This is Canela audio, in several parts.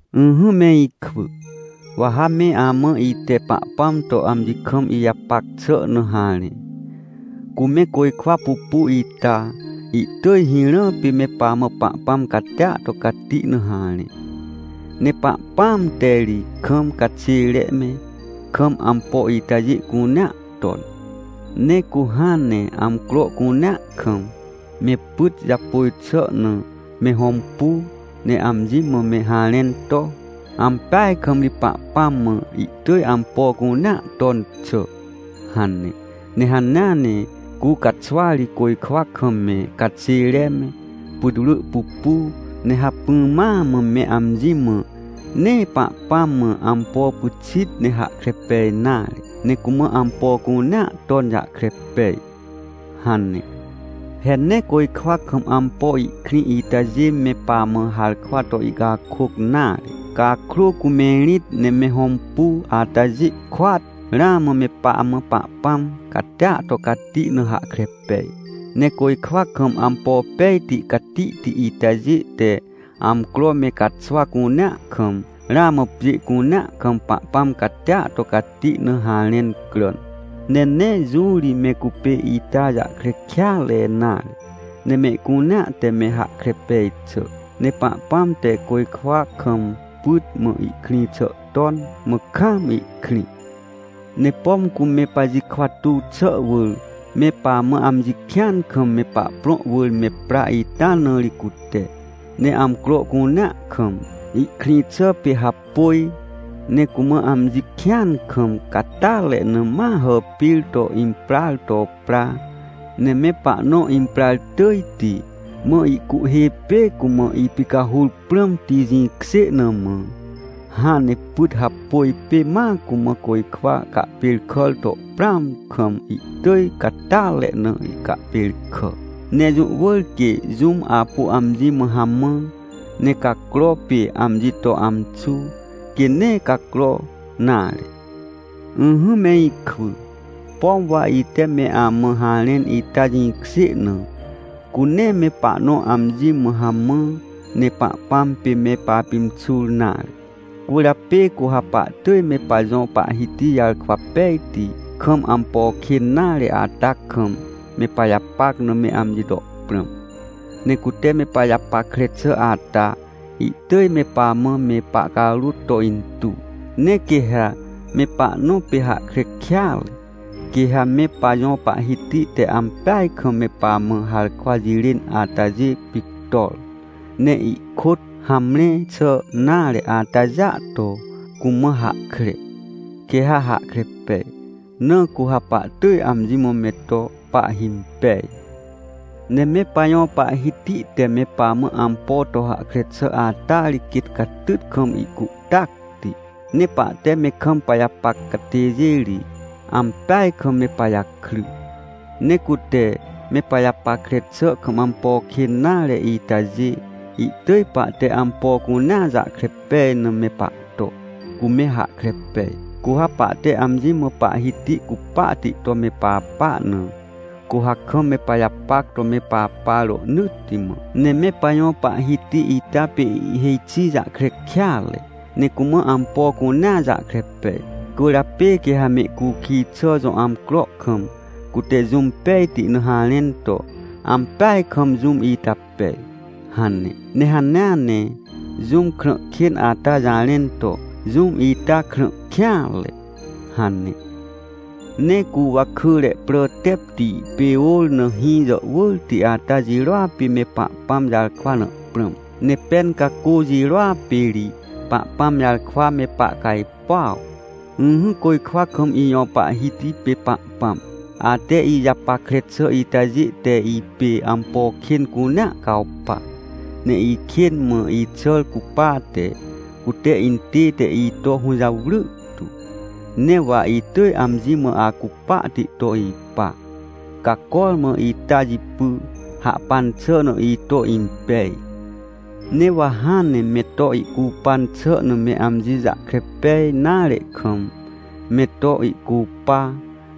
Ỹhỹ me ikwỳ, wa ha me amã ite Pahpãm to amji kam ijapac xà na harẽ. Cu me côjkwa pupu ita, ihtỳj hirã pê me pamã Pahpãm catia to cati na harẽ. Ne Pahpãam te ri kam caxêre me, kam ampo itajê cunea ton. Ne cu hãn ne amcro cunea kam, me pyt japôj xà na me hõmpu, ne amji mã me harẽn to: “Ampeaj kam ri Pahpãm mã ihtỳj ampo cunea ton xà” hane. Ne hanea ne cu caxwari côjkwa kam me caxêre me, putwrỳ pupu, ne hacpỹ ma mã me amji mã: “Nee Pahpãm mã ampo pyxit ne hahkre pej nare, ne cumã ampo cunea ton jahkre pej” hane. He nee côjkwa kam ampo ihkrĩ itajê me pamã harkwa to ihcakôc nare, cakrô cu me rĩt ne me hõmpu atajê kôat, ramã me pamã Pahpãm catia to cati na hahkre pej. Ne côjkwa kam ampo pejti catihti itajê te amcro me caxwa cunea kam, ramã pjê cunea kam Pahpãm catia to cati na harẽn cràn. Ne nee jũ ri me cupê ita jahkre kêatre nare, ne mehcunea te me hahkre pej xà. Ne Pahpãm te côjkwa kam pyt mã ihkrĩ xà ton, mã kaam ihkrĩ. Ne pom cu me pajikwa tuw xà wỳr, me pamã amji kĩan kam me pahprõ wỳr me pra ita na ri cute, ne amcro cunea kam, ihkrĩ xà pê hapôj, ne cumã amji kĩan kam catyatre na ma hàpir to impraar to pra. Ne me pahnõ imprar tỳjti, mã ihcuhhê pê cumã ipicahur prãmti, jĩkjê na mã, hãn ne pyt hapôj pê ma cumã côjkwa cahpêrkàr to prãam kam, ihtỳj catyatre na ihcahpêrkà. Ne jũ wỳr quê jũm apu amji mã hamã, ne cacro pê amji to amxu, quê nee cacro nare. Ỹhỹ me ikwỳ, pom wa ite me amã harẽn ita jĩkjê na, cu nee me pahnõ amji mã hamã, ne Pahpãm pê me papimxur nare. Cwỳrjapê cu ha pahtỳj me pajõ Pahhiti jarkwa pejti, kam ampo kên nare ata kam, me pajapac na me amji to prãm. Ne cute me pajapackre xà ata, ihtỳj me pamã me pahcarôt to intuw. Ne quê ha me pahnõ pê hahkre kêatre, quê ha me pajõ Pahhiti te ampeaj kam me pamã harkwa jirên atajê pictor, ne ihkôt hamre xà nare atajêa to cumã hahkre, quê ha hahkre pej, na cu ha pahtỳj amji mã me to pahhimpej. Ne me pajõ Pahhiti te me pamã ampo to hahkre xà ata ri quêt catyt kam ihcuhtacti. Ne pahte me kam pajapac catêjê ri, ampeaj kam me pajakry. Ne cute me pajapackre xà kam ampo kên nare itajê, ihtỳj pahte ampo cunea jahkre pej na me pahto, cu me hahkre pej. Cu ha pahte amji mã Pahhiti cupahti to me papa na, cu ha kam me pajapac to me papa rohnỳtti mã. Ne me pajõ Pahhiti ita pê ihhêj xi jahkre kêatre, ne cumã ampo cunea jahkre pej. Cwỳrjapê quê ha mehcukij xà jõ amcro kam, cute jũm pejti na harẽn to: “Ampeaj kam jũm ita pej” hane. Ne hanea ne jũm krã kên ata jarẽn to: “Jũm ita krã kêanre” hane. Ne cu wakỳre prà tepti pê ôr na hĩ jàhwỳrti ata jirôa pê me Pahpãm jarkwa na prãm. Ne pen cacô jirôa pê ri Pahpãm jarkwa me pahcajpuaw. Ỹhỹ côjkwa kam ijõ Pahhiti pê Pahpãm. Ate ijapackre xà itajê te ipê ampo kên cunea cawpa, ne ikên mã ixàr cupate, cute intête ito hũjawry tu. Ne wa itỳj amji mã acupahti to ipa, ca cormã ita jipy, hahpan xà na ito impej. Ne wa hãn ne me to ihcupan xà na me amji jahkre pej nare kam, me to ihcupa,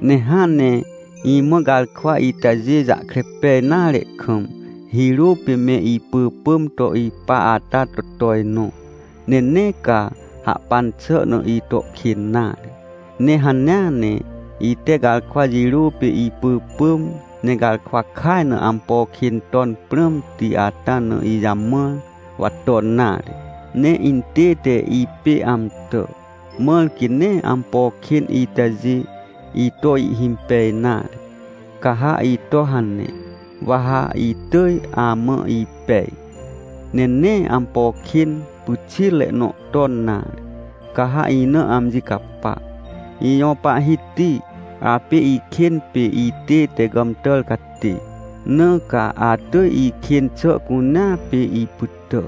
ne hãn ne imã garkwa itajê jahkre pej nare kam, hirô pê me ipỳpỳm to ipa ata to tojnõ, ne nee ca hahpan xà na ito kên nare. Ne hanea ne ite garkwa jirô pê ipỳpỳm, ne garkwa kaj na ampo kên ton prãmti ata na ijamãr, wa ton nare. Ne intête ipê amtà, mãr quê nee ampo kên itajê ito ihhimpej nare. Ca ha ito hane, wa ha itỳj amã ipej, ne nee ampo kên pyxitre nõ ton nare, ca ha ina amji capa. Ijõ Pahhiti, apê ikên pê itête gàmtàr catê, na ca atỳj ikên xà cunea pê ipytà.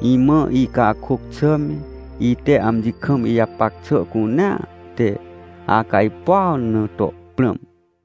Imã icakôc xà me, ite amji kam ijapac xà cunea te acajpuaw na to prãm.